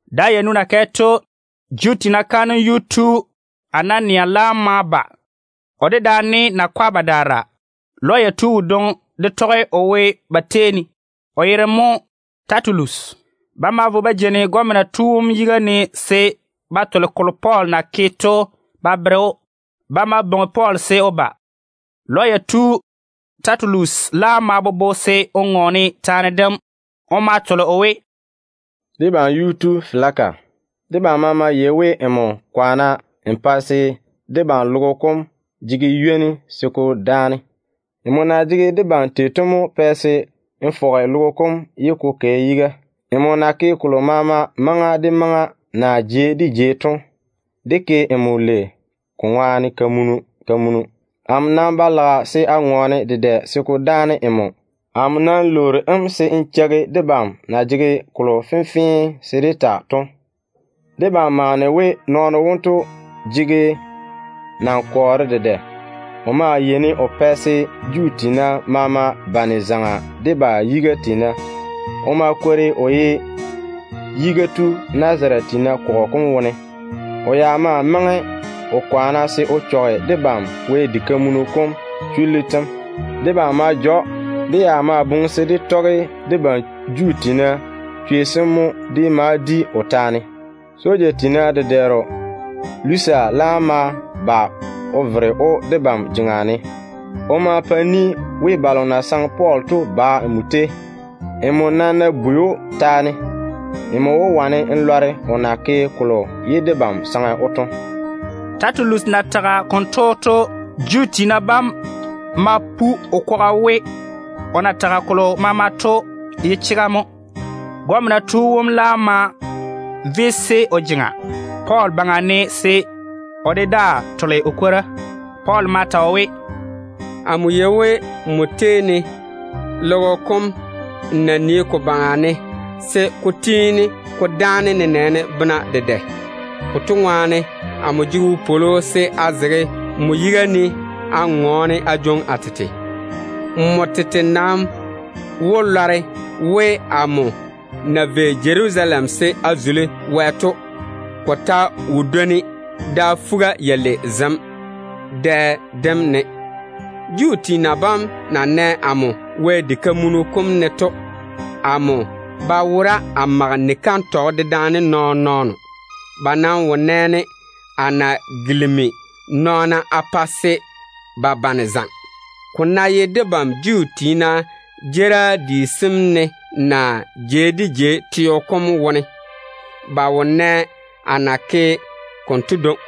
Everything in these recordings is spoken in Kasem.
Da yanu na kɛ to, Juu tiina kaanem yuu tu Anania laam ma ba, o dedaane nakwa badaara. Lɔya tu wodwoŋi de tɔge o wo ba tei ne, o yere mo Tɛtulus. Ba ma vo ba jeini gɔmena tu wom yiga ne se ba tole kolo Pɔɔl na ke to ba bere‑o. Ba ma bwoŋi Pɔɔl se o ba. Lɔya tu Tɛtulus laam ma bobo se o ŋɔɔne taane dem. O ma tole o we, “Debam yuu tu Feliki, debam maama yei we, nmo kwaane n pa se debam logo kom jege ywoni se ko dáane. Nmo na jege debam tei to mo pɛ se n fɔge dé teo kom ye ko kɛ yiga. Nmo na ke kolo maama maŋa de maŋa naa jei de jei to, dé ke nmo lei ko ŋwaane kamunu kamunu. Amo nam ba lage se a ŋɔɔne dedɛ se ko daane nmo. Amo nam lwoori‑m se n cheigi debam na jege kolo fenfee se dé ta to. Debam maane we nɔɔno wonto jege nankɔɔre dedɛ. Logo baŋa ni maama ne o yeini o pa se bobɔga taa tui Juu tiina maama tetare ne. O maa kwori o ye yiga tu Nazarete tiina kɔgɔ kom wone. O ya ma maŋe o kwaane se o chɔge debam Wɛ diga kam chullu tem. Debam ma ja‑o. [Dé ya maa lage se dé tɔge debam Juu tiina chwei sem mo dé ma di o taane. Soja tiina dedɛɛro Lusia laam ma ba o vere‑o de dam debam jea ne. O ma pa ni we balo na saŋe Pɔɔl to ba nmo tei.] Nmo nam ná bwei‑o taane, nmo wó wane n lɔre o na ke kolo ye debam saŋe‑o to.” Tɛtulus na tage konto to, Juu tiina bam ma pu o kwaga we, o na tage kolo maama to ye chega mo. Gɔmena tu wom laam ma yeese o jeŋa Pɔɔl baŋa ne se o de daa tole o kwora. Pɔɔl ma ta o we, “Amo yei we nmo tei dé teo kom n nii ko baŋa ne se ko tiini ko dáane nenɛɛne bena dedɛ. Konto ŋwaane amo jege wopwolo se a zege nmo yiga ne a ŋɔɔne a jwoŋi a tete. Nmo tete nam wó lɔre we amo na vei Jerusalem se a zuli Wɛ to, ko ta wo dwoni da fuga-yalei zem dɛ dem ne. Juu tiina bam na nɛ amo Wɛ diga kam ne to, amo ba wora a mage ni-kantɔgɔ dedaane nɔɔn-nɔɔno. Ba nam wo nɛ-ne a na pɛ vuvuga zo nɔɔna tetare ne. Ko ná ye debam Juu tiina jeerim di sem ne naa jei de jei teo kom wone, ba wo nɛ a na ke konto dwoŋi.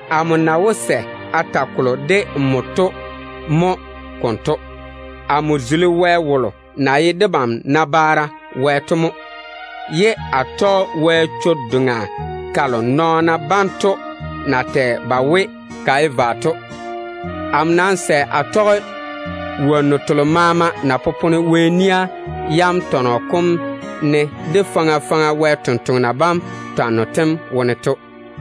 Amo nam na wó sɛ a ta kolo de nmo to mo konto: Amo zuli Wɛ wolo na ye debam nabaara Wɛ to mo, ye a tɔge Wɛ chwo-doŋa kalo nɔɔna banto na tɛ ba we ka ye vwa to. Amo nam sɛ a tɔge wonnu telo maama na popone Wɛ nia yam tɔnɔ kom ne, de faŋa faŋa Wɛ sampwori sem twanno tem wone to.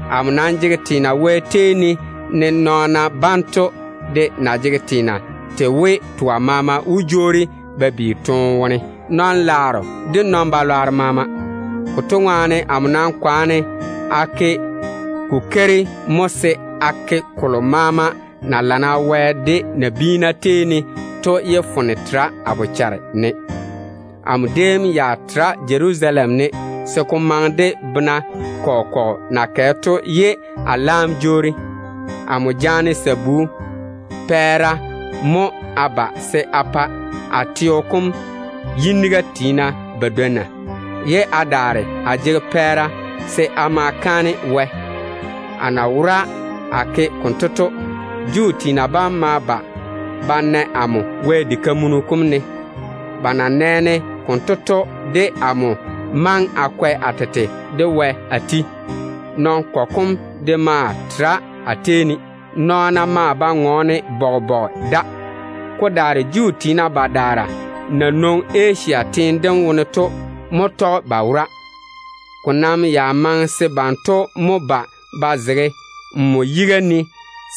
Amo nam jege teena Wɛ tei ne, ne nɔɔna banto de na jege teena tei we, twa maama wó jwoori ba bi toone wone, nɔn-ŋona de nɔn-balwaaro maama. Konto ŋwaane amo nam kwaane a ke kokeiri mo se a ke kolo maama na lana Wɛ de nabiina tei ne to, ye foone tera a bochare ne. Amo déem ya tere Jerusalem ne se ko maŋe de bena kɔgɔ kɔgɔ na kɛ to ye a laam jwoori a ba. Amo jaane sabu pɛɛra mo a ba se a pa a teo kom yiniga tiina badwonna, ye a daare a jege pɛɛra se a ma a kaane Wɛ. A na wora a ke konto to, Juu tiina bam ma ba ba na amo Wɛ diga kam wone. Ba na nɛ-ne konto to, de amo maŋe a kwɛ a tete de Wɛ a ti. Nɔn-kɔgɔ de maa tere a tei ne. Bobɔga de nam tera. Ko daare Juu tiina badaara na nwoŋi Asia teene dem wone to mo tɔge ba wora. Banto ya ná jege woŋo de amo, ko nam ya maŋe se banto mo ba ba zege nmo yiga ne,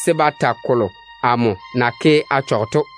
se ba ta kolo amo na ke a chɔge to.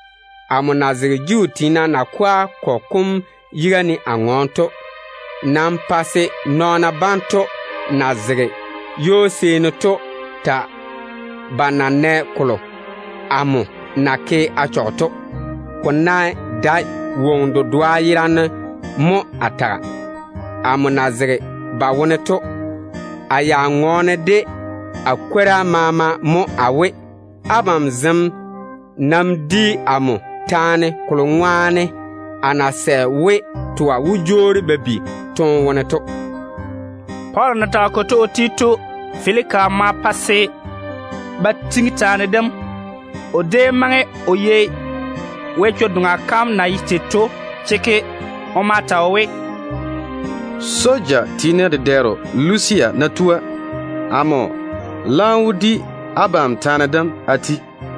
Amo na zege Juu tiina nakwa kɔgɔ kom yiga ne a ŋɔɔne to, nam pa se nɔɔna banto na zege ywo-seeni to ta ba na nɛ kolo amo na ke a chɔge to, ko ná dae woŋo dedoa yerane mo a taga. Amo na zege ba wone to, a ya ŋɔɔne de a kwora maama mo a we, ‘Abam zem nam di amo taane kolo ŋwaane a na sɛ we twa wó jwoori ba bi toone wone to.’” Pɔɔl na tage konto o ti to, Feliki ma pa se ba tiŋi taane dem. O déem maŋe o yei Wɛ chwo-doŋa kam na ye tei to chekke. O ma ta o we, “Soja tiina dedɛɛro Lusia ná tua, amo laam wó di abam taane dem a ti.”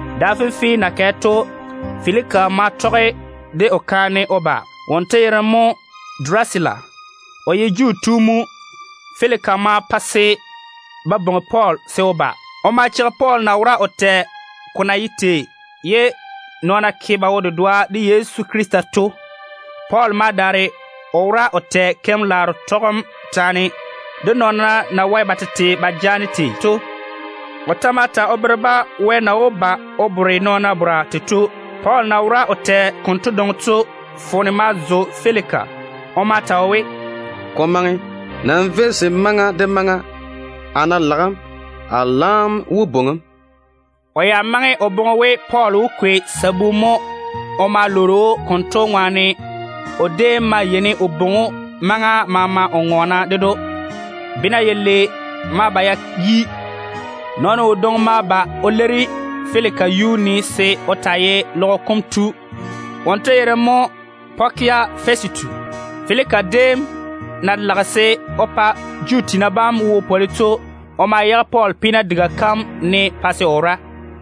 Da fenfee na kɛ to, Feliki ma tɔge de o kaane Durusila o ba. Wonto ye Juu tu mo. Feliki ma pa se ba bwoŋi Pɔɔl se o ba. Ba ma cheigi Pɔɔl na wora o tɛ ko na ye tei ye nɔɔna ke ba wo-dedoa de Yezu Krista to. Pɔɔl ma daare o wora o tɛ keim-laaro tɔgem taane, de nɔɔna na wae ba tete ba jaana tei to. O ta ma ta o bere-ba Wɛ na wó ba o bore nɔɔna bora tei to. Pɔɔl na wora o tɛ konto dwoŋi to, foone ma zo Feliki. O ma ta o we, “Ko maŋe. Nam véi, se maŋa de maŋa, a ná lage‑m, a laam wó bwoŋi‑m.” O ya maŋe o boŋe we Pɔɔl wó kwei sabu mo o ma lwoori‑o. Konto ŋwaane mo o déem yeini o bwoŋi‑o maŋa maama o ŋɔɔne ded‑o. Bena yalei ma ba ya yi. Nɔɔno wodwoŋi ma ba o leiri Feliki yuu ne se o taa ye logo kom yiga tu. Wonto yere mo Pɔkia Fɛsitu. Feliki déem na lage se o pa Juu tiina bam wo pwoli to, o ma yage Pɔɔl peena diga kam ne se o taa wora.